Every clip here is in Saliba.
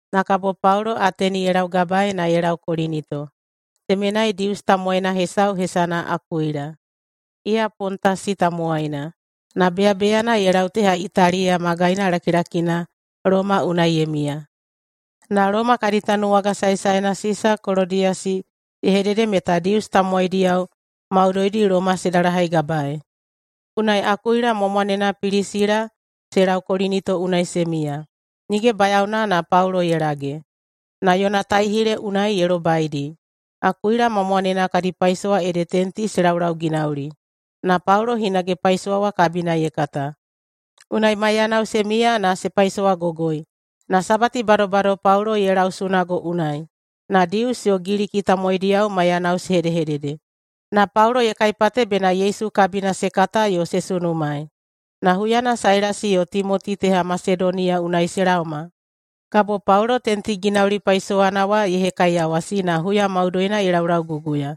Na kabo Paulo Ateni ye laugabaei na ye lau Kolinito. Temenai Dius tamowaina hesau hesana Akuila. Iya Pontasi tamowaina, na beyabeyana ye lau teha Italiya magaina lakilakina Loma unai ye miya. Na Loma kadi tanuwaga saesaena Sisa Kolodiyasi ye hedede meta Dius tamowaidiyao maudoidi Loma se dalahaigabaei. Unai Akuila ma mwanena Pilisila se lau Kolinito unai se miya. Nige bayaona na Paulo ye lage, na yona taihile unai ye lobaidi. Akuila ma mwanena kadi paisowa ede tenti se laulauginauli, na Paulo hinage paisowa wa kabina ye kata. Unai maiyanao se miya na se paisowagogoi. Na Sabati badobado Paulo ye lau sunago unai, na Dius yo Giliki tamowaidiyao maiyanao se hedehedede, na Paulo ye kaipate bena Yesu kabina se kata yo se sunumaei. Na huyana Sailasi yo Timoti teha Masedoniya unai se laoma, kabo Paulo tentiginauli paisowana wa ye hekaiyawasi na huya maudoina ye laulauguguya.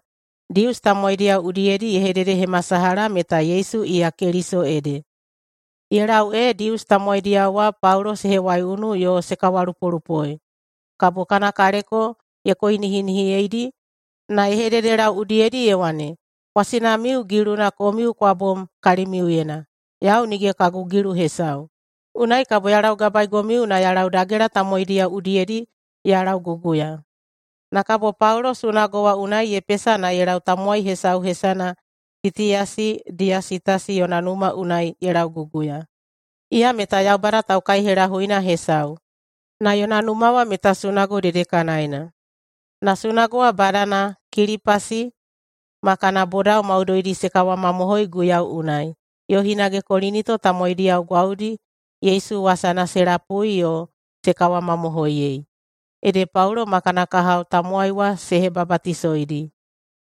Dius tamowaidiyao udiyedi ye hededehemasalaha meta Yesu iya Keliso ede. Ye lau ee Dius tamowaidiyao wa Paulo se hewaiunu yo se kawalupolupoi, kabo kana kaleko ye koinihinihiyeidi, na ye hededelau udiyedi ye wane, “Kwasinamiu giluna komiu kwa bom kalimiuyena! Yau nige kagu gilu hesau. Unai kabo ya laugabaegomiu na ya lau dagela tamowaidiyao udiyedi ya lauguguya.” Na kabo Paulo sunago wa unai ye pesa na ye lau tamowai hesau hesana Titiyasi Diyasitasi yona numa unai ye lauguguya. Iya meta Yaubada taukaihelahuina hesau, na yona numa wa meta sunago dedekanaena. Na sunago wa badana Kilipasi ma kana bodao maudoidi se kawamamohoi Guiyau unai. Yo hinage Kolinito tamowaidiyao gwaudi Yesu wasana se lapui yo se kawamamohoiyei, ede Paulo ma kana kahao tamowai wa se hebabatisoidi.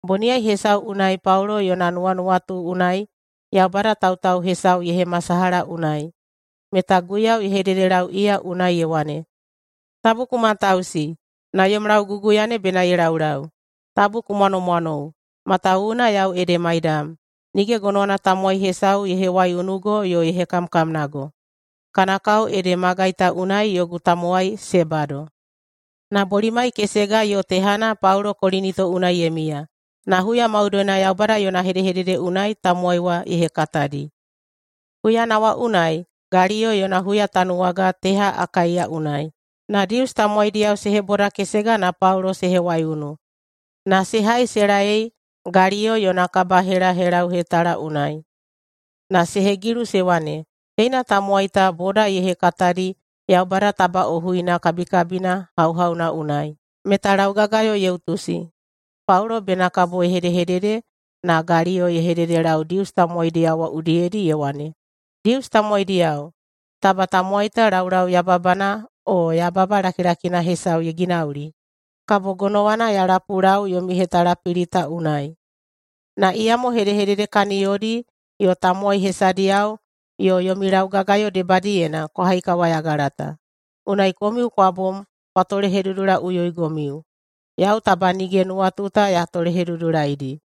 Boniyai hesau unai Paulo yona nuwanuwatu unai Yaubada tautau hesau ye hemasalaha unai, meta Guiyau ye hededelau iya unai ye wane, “Tabu ku matausi, na yom lauguguya ne bena ye laulau! Tabu ku mwanomwanou, matawuwuna yau ede maidam. Nige gonowana tamowai hesau ye hewaiunugo yo ye hekamkamnago. Kana kao ede magai ta unai yogu tamowai se bado.” Na bolimai kesega yo tehana Paulo Kolinito unai ye miya, na huya maudoina Yaubada yona hedehedede unai tamowai wa ye hekatadi. Huyana wa unai Galiyo yona huyatanuwaga teha Akaiya unai. Na Dius tamowaidiyao se hebodakesega na Paulo se hewaiunu, na se hai se laei Galiyo yona kabahelahelauhetala unai. Na se hegilu se wane, “Teina tamowai ta boda ye hekatadi Yaubada tabaꞌohuina kabikabina hauhauna unai, meta laugagayo ye utusi.” Paulo bena kabo ye hedehedede, na Galiyo ye hededelau Dius tamowaidiyao wa udiyedi ye wane, “Dius tamowaidiyao! Taba tamowai ta laulau yababana o yababa lakilakina hesau ye ginauli, kabo gonowana ya lapulau yomi hetalapili ta unai. Na iyamo hedehedede kaniyodi yo tamowai hesadiyao yo yomi laugagayo debadiyena kwa haikawayagala ta, unai komiu kwa bom kwa tolehedudulaiꞌuyoigomiu. Yau taba nige nuwatu ta ya tolehedudulaidi.”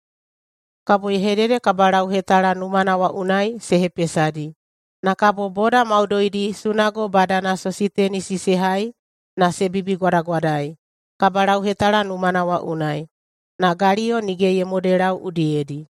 Kabo ye hedede kabalauhetala numana wa unai se hepesadi. Na kabo boda maudoidi sunago badana Sositenisi se hai na se bibigwadagwadai kabalauhetala numana wa unai. Na Galiyo nige ye modelau udiyedi.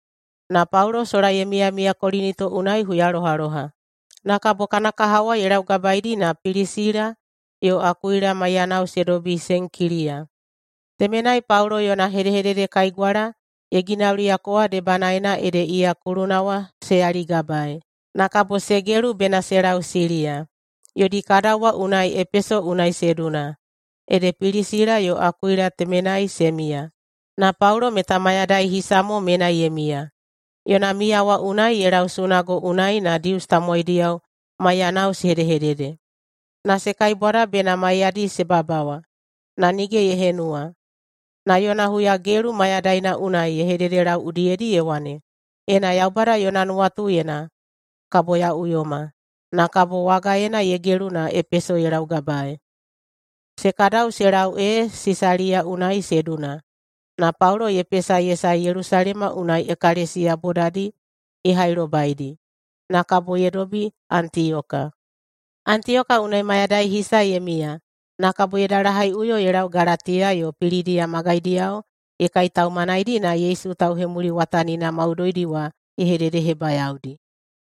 Na Paulo sola ye miyamiya Kolinito unai huyalohaloha. Na kabo kana kahao wa ye laugabaeidi na Pilisila yo Akuila maiyanao se dobi Senkiliya. Temenai Paulo yona hedehededekaigwala ye ginauliyako wa debanaena ede iya kuluna wa se yaligabae. Na kabo se gelu bena se lau Siliya. Yodi kadau wa unai Epeso unai se duna, ede Pilisila yo Akuila temenai se miya. Na Paulo meta mayadai hisa mo menai ye miya. Yona miya wa unai ye lau sunago unai na Dius tamowaidiyao maiyanao se hedehedede. Na se kaibwada bena maiyadi se babawa, na nige ye henuwa. Na yona huyagelu mayadaina unai ye hededelau udiyedi ye wane, “Ena Yaubada yona nuwatuyena, kabo ya uyoma.” Na kabo wagaena ye gelu na Epeso ye laugabaei. Se kadau se lau ee Sisaliya unai se duna. Na Paulo ye pesa ye sae Yelusalema unai ekalesiya bodadi ye hailobaidi. Na kabo ye dobi Antiyoka. Antiyoka unai mayadai hisa ye miya, na kabo ye dalahaiꞌuyo ye lau Galatiya yo Pilidiya magaidiyao ye kaitaumanaidi na Yesu tauhemuliwatanina maudoidi wa ye hededehebayaodi.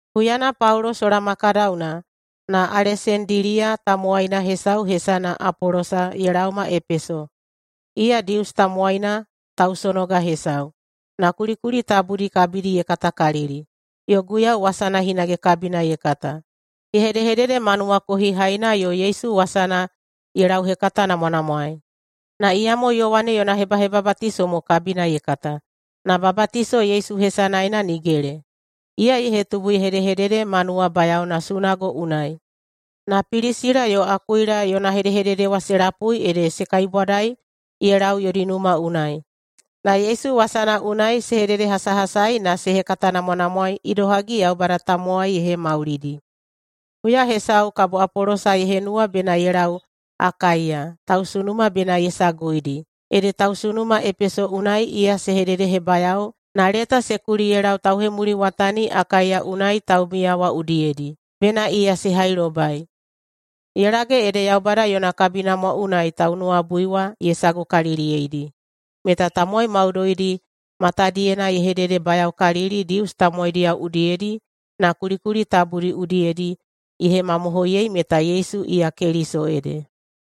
Huyana Paulo sola ma kadauna, na Alesandiliya tamowaina hesau hesana Apolosa ye laoma Epeso. Iya Dius tamowaina tausonoga hesau, na kulikuli tabudi kabidi ye katakalili, yo Guiyau wasana hinage kabina ye kata. Ye hedehedede ma nuwakohihaina yo Yesu wasana ye lauhekatanamwanamwaei. Na iyamo Yowane yona hebahebabatiso mo kabina ye kata, na babatiso Yesu hesanaena nigele. Iya ye hetubu ye hedehedede ma nuwabayaona sunago unai. Na Pilisila yo Akuila yona hedehedede wa se lapui ede se kaibwadai ye lau yodi numa unai, na Yesu wasana unai se hededehasahasai na se hekatanamwanamwaei idohagi Yaubada tamowai ye hemaulidi. Huya hesau kabo Apolosa ye henuwa bena ye lau Akaiya, tausunuma bena ye saguidi. Ede tausunuma Epeso unai iya se hededehebayao na leta se kuli ye lau tauhemuliwatani Akaiya unai taumiya wa udiyedi, bena iya se hailobai. Ye lage ede Yaubada yona kabinamwa unai taunuwabui wa ye sagukaliliyeidi. Meta tamowai maudoidi matadiyena ye hededebayaokalili Dius tamowaidiyao udiyedi na kulikuli tabudi udiyedi ye hemamohoiyei meta Yesu iya Keliso ede.